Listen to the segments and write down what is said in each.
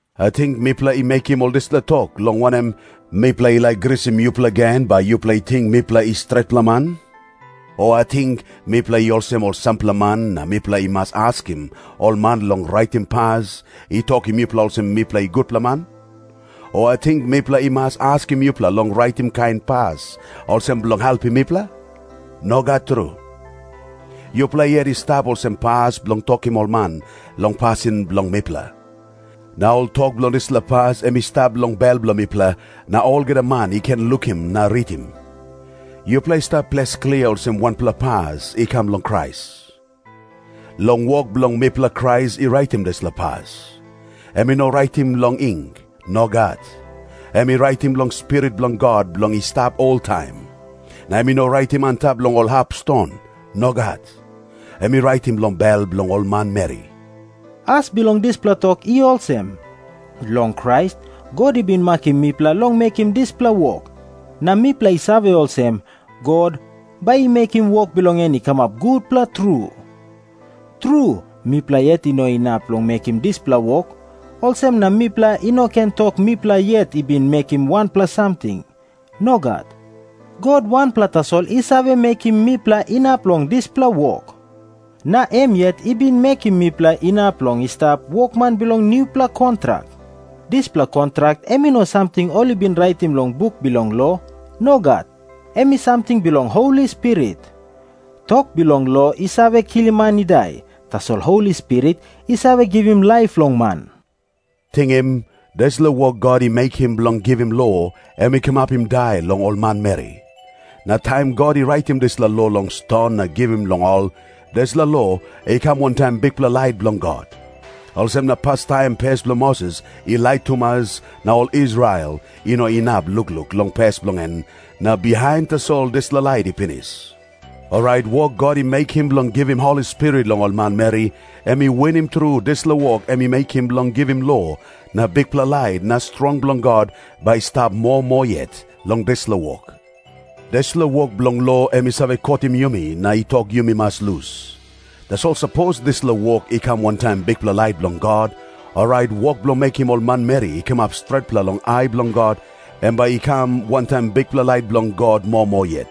Ating mipela i mekim ol dispela tok, long wanem, mipela i laik grisim yupela gen bai yupela i ting mipela i stretpela man? O ating mipela i olsem ol sampela man na mipela i mas askim ol man long raitim pas i tokim yupela olsem mipela i gutpela man? O ating mipela i mas askim yupela long raitim kain pas olsem bilong helpim mipela? Nogat tru. Yupela yet i stap olsem pas bilong tokim ol man long pasin bilong mipela. Na ol tok bilong dispela pas em i stap long bel bilong mipela, na olgeta man i ken lukim na ritim. Yupela i stap ples klia olsem wanpela pas i kam long Krais. Long wok bilong mipela Krais i raitim dispela pas. Em i no raitim long ing. Nogat. Em i raitim long Spirit bilong God bilong i stap oltaim. Na em i no raitim antap long ol hap ston. Nogat. Em i raitim long bel bilong ol manmeri. As bilong dispela tok i olsem. Long Krais God i bin makim mipela long mekim dispela wok, na mipela i save olsem God bai i mekim wok bilong en i kamap gutpela tru. Tru, mipela yet i no inap long mekim dispela wok, olsem na mipela i no ken tok mipela yet i bin mekim wanpela samting. Nogat. God wanpela tasol i save mekim mipela inap long dispela wok. Na em yet i bin mekim mipela inap long i stap wokman bilong nupela kontrak. Dispela kontrak em i no samting ol i bin raitim long buk bilong lo. Nogat. Em i samting bilong Holi Spirit. Tok bilong lo i save kilim man i dai, tasol Holi Spirit i save givim laip long man. Tingim. Dispela wok God i mekim bilong givim lo, em i kamapim dai long ol manmeri. Na taim God i raitim dispela lo long ston na givim long ol, dispela lo i kam wantaim bikpela lait bilong God. Olsem na pastaim pes bilong Moses i lait tumas, na ol Israel i no inap lukluk long pes bilong en, na bihain tasol dispela lait i pinis. Orait wok God i mekim bilong givim Holi Spirit long ol manmeri, em i winim tru dispela wok em i mekim bilong givim lo, na bikpela lait na strong bilong God bai i stap moa moa yet long dispela wok. Dispela wok bilong lo em i save kotim yumi na i tok yumi mas lus. Tasol sapos dispela wok i kam wantaim bikpela lait bilong God, orait wok bilong mekim ol manmeri i kamap stretpela long ai bilong God, em bai i kam wantaim bikpela lait bilong God moa moa yet.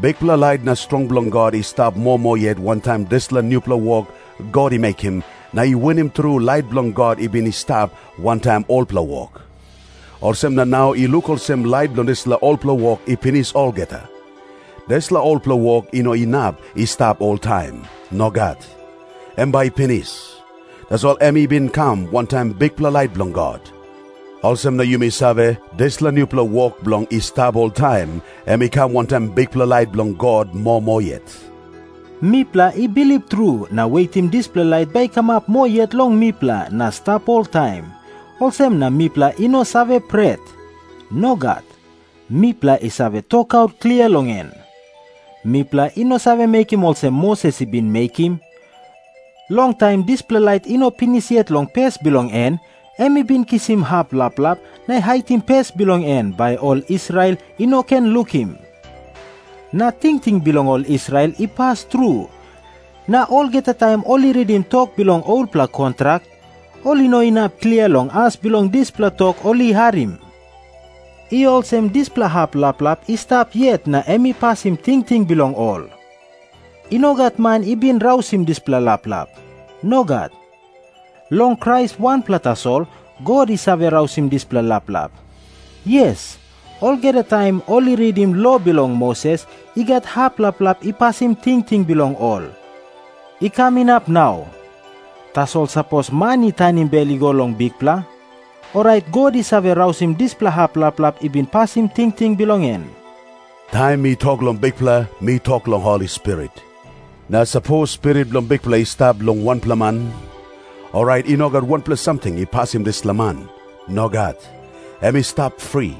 Bikpela lait na strong bilong God i stap moa moa yet wantaim dispela nupela wok God i mekim, na i winim tru lait bilong God i bin i stap wantaim olpela wok. Olsem na nau i luk olsem lait bilong dispela olpela wok i pinis olgeta. Dispela olpela wok i no inap i stap oltaim. Nogat. Em bai i pinis. Tasol em i bin kam wantaim bikpela lait bilong God. Olsem na yumi save, dispela nupela wok bilong i stap oltaim, em i kam wantaim bikpela lait bilong God moa moa yet. Mipela i bilip tru na wetim dispela lait bai i kamap moa yet long mipela na i stap oltaim, olsem na mipela i no save pret. Nogat. Mipela i save tokaut klia long en. Mipela i no save mekim olsem Moses i bin mekim. Long taim dispela lait i no pinis yet long pes bilong en, em i bin kisim hap laplap na haitim pes bilong en, bai ol Israel i no ken lukim. Na tingting bilong ol Israel i pas tru, na olgeta taim ol i ritim tok bilong olpela kontrak, ol i no inap klia long as bilong dispela tok ol i harim. I olsem dispela hap laplap i stap yet na em i pasim tingting bilong ol. I no gat man i bin rausim dispela laplap. Nogat. Long Krais wanpela tasol God i save rausim dispela laplap. Yes, olgeta taim ol i ritim lo bilong Moses, i gat hap laplap i pasim tingting bilong ol, i kam inap long nau. Tasol sapos man i tanim bel i go long Bikpela, orait God i save rausim dispela hap laplap i bin pasim tingting bilong en. Taim mi tok long Bikpela mi tok long Holi Spirit. Na sapos Spirit bilong Bikpela i stap long wanpela man, orait i no gat wanpela samting i pasim dispela man. Nogat. Em i stap fri.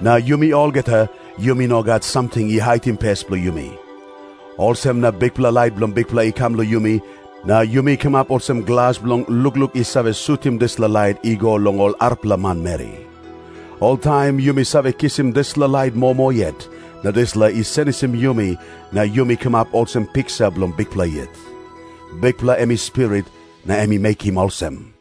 Na yumi olgeta, yumi no gat samting i haitim pes bilong yumi. Olsem na bikpela lait bilong Bikpela i kam long yumi, na yumi kamap olsem glas bilong lukluk i save sutim dispela lait i go long ol arapela manmeri. Oltaim yumi save kisim dispela lait moa moa yet, na dispela i senisim yumi, na yumi kamap olsem piksa bilong Bikpela yet. Bikpela em i Spirit, na em i mekim olsem.